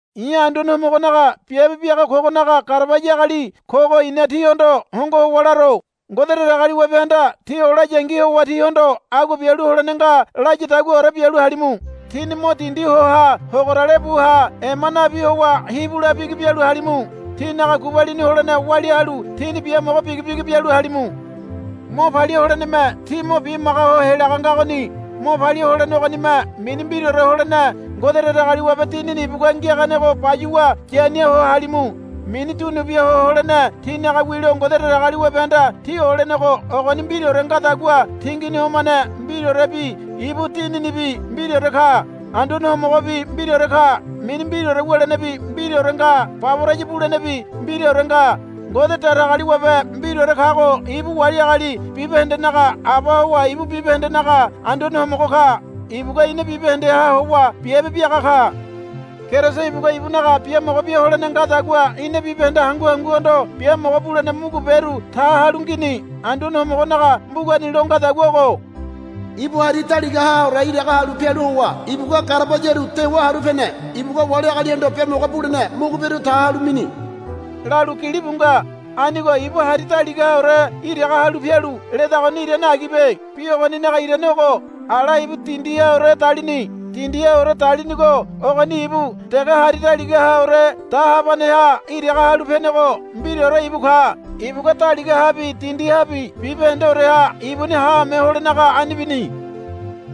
I̱ Anduane Homogonaga biabe biaga kogonaga garabaya agali kogo i̱na tíhondo hongo howa laro. Ngode Datagaliwabehanda tí olayangi howa tíhondo agua bialu holene nga layadaguaore bialu halimu. Tíni mo dindi ho ha hogorale bu ha ema nabi howa hibu la bigi bialu halimu. Tínaga gubalini holene walia halu tíni biamogo bigi bigi bialu halimu. Mo palia holeneme tí mo bimaga ho helaga ngagoni. Mo palia holene ogonime mini mbiraore holene Ngode Datagaliwabe Dinini ibugua ngiaganego bayuwa yania ho halimu. Mini dunu bia ho holene tínaga wilo Ngode Datagaliwabehanda tí olenego ogoni mbiraore ngadagua tingini homane mbiraorebi ibu Dininibi mbiraore ka. Anduane Homogobi mbiraore ka. Mini mbiraore wulenebi mbiraore nga baboraya bulenebi mbiraore nga. Ngode Datagaliwabe mbiraore kago ibu wali agali bibahendenaga Aba howa ibu bibahendenaga Anduane Homogo ka. Ibugua ina bibahendeha howa biabe biaga ka. Keriso ibugua ibunaga biamogo bia holene ngadagua ina bibahende hangu hanguhondo biamogo bulene muguberu ta halu ngini. Anduane Homogonaga mbugani lo ngadagua ogo, Ibu hari daligahaore iraga halu pialu howa ibugua garabayaru dewa haru pene. Ibugua wali agalihondo biamogo bulene muguberu ta halu mini, lalu gilibu nga. Anigo, Ibu hari daligahaore iraga halu pialu, ledagoni irane agibe. Bi ogoninaga irane ogo. Ala ibu dindihaore dalini. Dindihaore dalinigo ogoni ibu dege hari daligahaore dahabaneha iraga halu penego mbiraore ibu ka. Ibugua daligahabi dindihabi bibahendeoreha ibuni haame holenaga ani bini.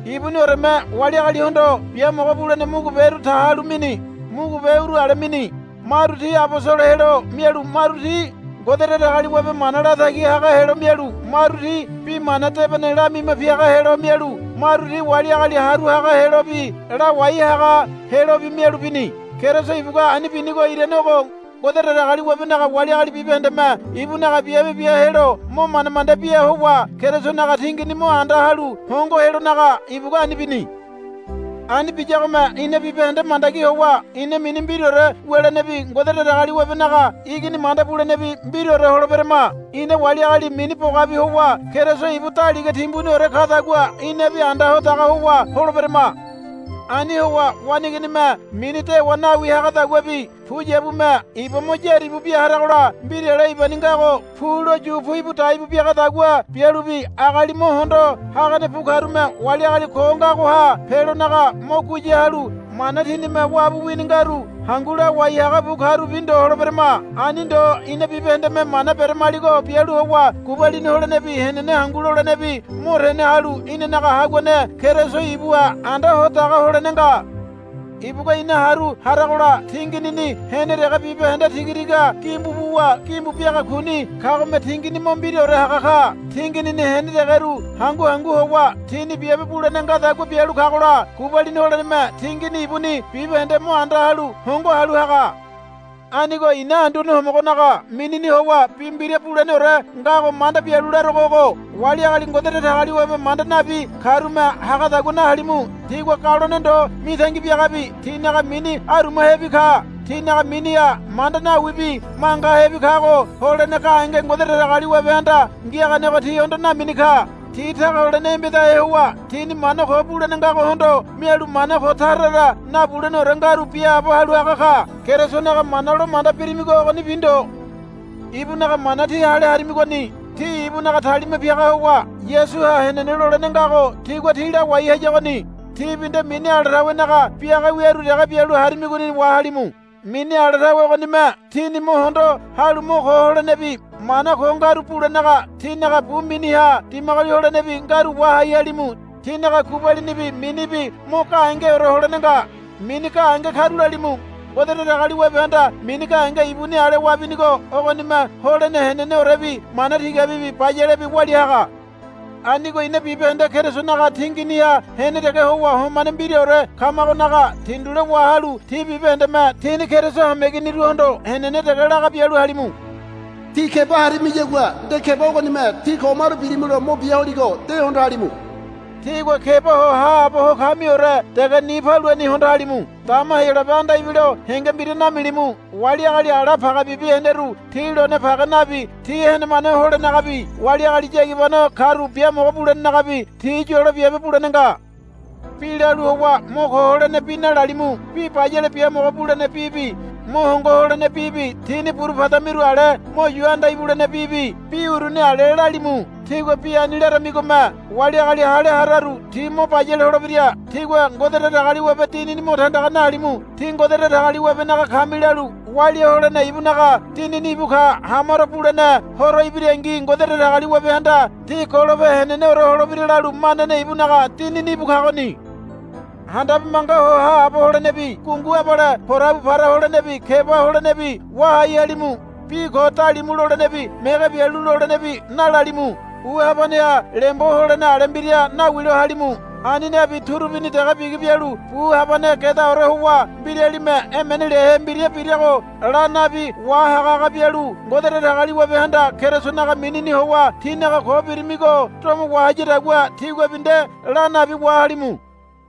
Ibunioreme wali agalihondo biamogo bulene muguberu ta halu mini. Mugube uru ale mini. Maru ti abosolo helo mialu maru ti Ngode Datagaliwabe mana latagi haga helo mialu maru ti Bi Mana Debene lamima piaga helo mialu maru ti wali agali haru haga helobi lawai haga helobi mialu bini. Keriso ibugua ani binigo irane ogo. Ngode Datagaliwabenaga wali agali bibahendeme ibunaga biabe bia helo mo manda manda bia howa Kerisonaga tingini mo anda halu hongo helonaga ibugua ani bini. Ani biyagome ina bibahende mandagi howa ina mini mbiraore wulenebi Ngode Datagaliwabenaga Igini manda bulenebi mbiraore holeberama. Ina wali agali mini bogabi howa Keriso ibu daliga timbuniore kadagua inabi anda ho daga howa holeberama. Ani howa waneiginime mini dewa nawi hagadaguabi puyabume iba mo yaribu bia haragola mbirale ibani ngago pulo yu puibu daibu biagadagua bialubi agali mo hondo hagane bu karume wali agali ko ngagoha pelonaga mo guya halu mana tinime wabu wini ngaru hangu lawai haga bu karubi ndo holeberema. Ani ndo ina bibahendeme mana beramaligo bialu howa gubalini holenebi henene hangu lolenebi mo tene halu inanaga haguane Keriso ibuha anda ho daga holene nga. Ibugua ina haru haragola tinginini hene dege bibahende tigatiga gimbu buwa gimbu biaga kuni kagome tingini mo mbiraore haga ka. Tinginini hene degeru hangu hangu howa tini biabe bulene ngadagua bialu kagola gubalini holeneme tingini ibuni bibahende mo anda halu hongo halu haga. Anigo i̱na Anduane Homogonaga minini howa bi mbira buleneore ngago manda bialu larogo ogo, Wali agali Ngode Datagaliwabe manda nabi karume hagadagua nahalimu. Tigua galone ndo mitangi biagabi tinaga mini arumahebi ka. Tinaga miniha manda nawibi mangahebi kago holene gahenge Ngode Datagaliwabehanda ngiaganego tihondo namini ka. Ti taga holene embedahe howa tini mana ko bulene ngagohondo mialu mana ko tara tara nabuleneore ngaru biaabo halu haga ka. Kerisonaga mana lo manda birimigo ogonibi ndo. Ibunaga mana tí hale harimigoni. Tí ibunaga talima piaga howa Yasuha henene lolene ngago tigua tí lawai hayagoni. Tíbi nde mini ala tawenaga biaga wiaru dege bialu harimigoni wahalimu. Mini ala tawe ogonime tíni mo hondo halu mo ko holenebi mana ko ngaru bulenaga tínaga bu miniha dimagoli holenebi ngaru wahai halimu. Tínaga gubalinibi minibi mo gahengeore holene nga. Mini gahenge karulalimu. Ngode Datagaliwabehanda mini gahenge ibuni ale wabinigo ogonime holene heneneorebi mana tigabibi bayalebi walia haga. Anigo ina bibahende Kerisonaga tinginiha hene dege howa homane mbiraore kamagonaga tindule wahalu tí bibahendeme tíni Keriso hameiginiruhondo henene dege laga bialu halimu. Tí keba harimiyagua nde keba ogonime tí ko maru bilimulo mo bia holigo de hondo halimu. Tígua keba ho haabo ho kamiore dege ni paluani hondo halimu. Dama Heyolabe anda ibilo henge mbira namilimu. Wali agali ala pagebibi heneru ti lone page nabi ti henemane holenagabi wali agali yagibano karu biamogo bulenagabi ti yolo biabe bulene nga. Bi lalu howa mo ko holene bi nalalimu. Bi bayale biamogo bulene bibi mo hongo holene bibi tíni buru padamiru ale mo yu anda ibulene bibi bi uruni ale lalimu. Tígua bi ani laramigome wali agali hale hararu ti mo bayale holebira. Tígua Ngode Datagaliwabe Dinini mo tandaga nahalimu. Tí Ngode Datagaliwabenaga kami lalu walia holene ibunaga Dinini íbu ka. Hamaro bulene Horo ibirangi Ngode Datagaliwabehanda tí golope heneneore holebira lalu manane ibunaga Dinini íbu kagoni. Handabe manga ho haabo holenebi gungu abale porabu para holenebi keba holenebi wahai halimu. Bi ko dalimu lolenebi mege bialu lolenebi nalalimu. Bu habaneha lembo holene ale mbira nawilo halimu. Ani nabi turubini dege bigi bialu bu habane gedaore howa mbiralime emene liahe mbira birago la nabi wahaga haga bialu Ngode Datagaliwabehanda Kerisonaga minini howa tínaga ko birimigo domo wahayadagua tíguabi nde la nabi wahalimu.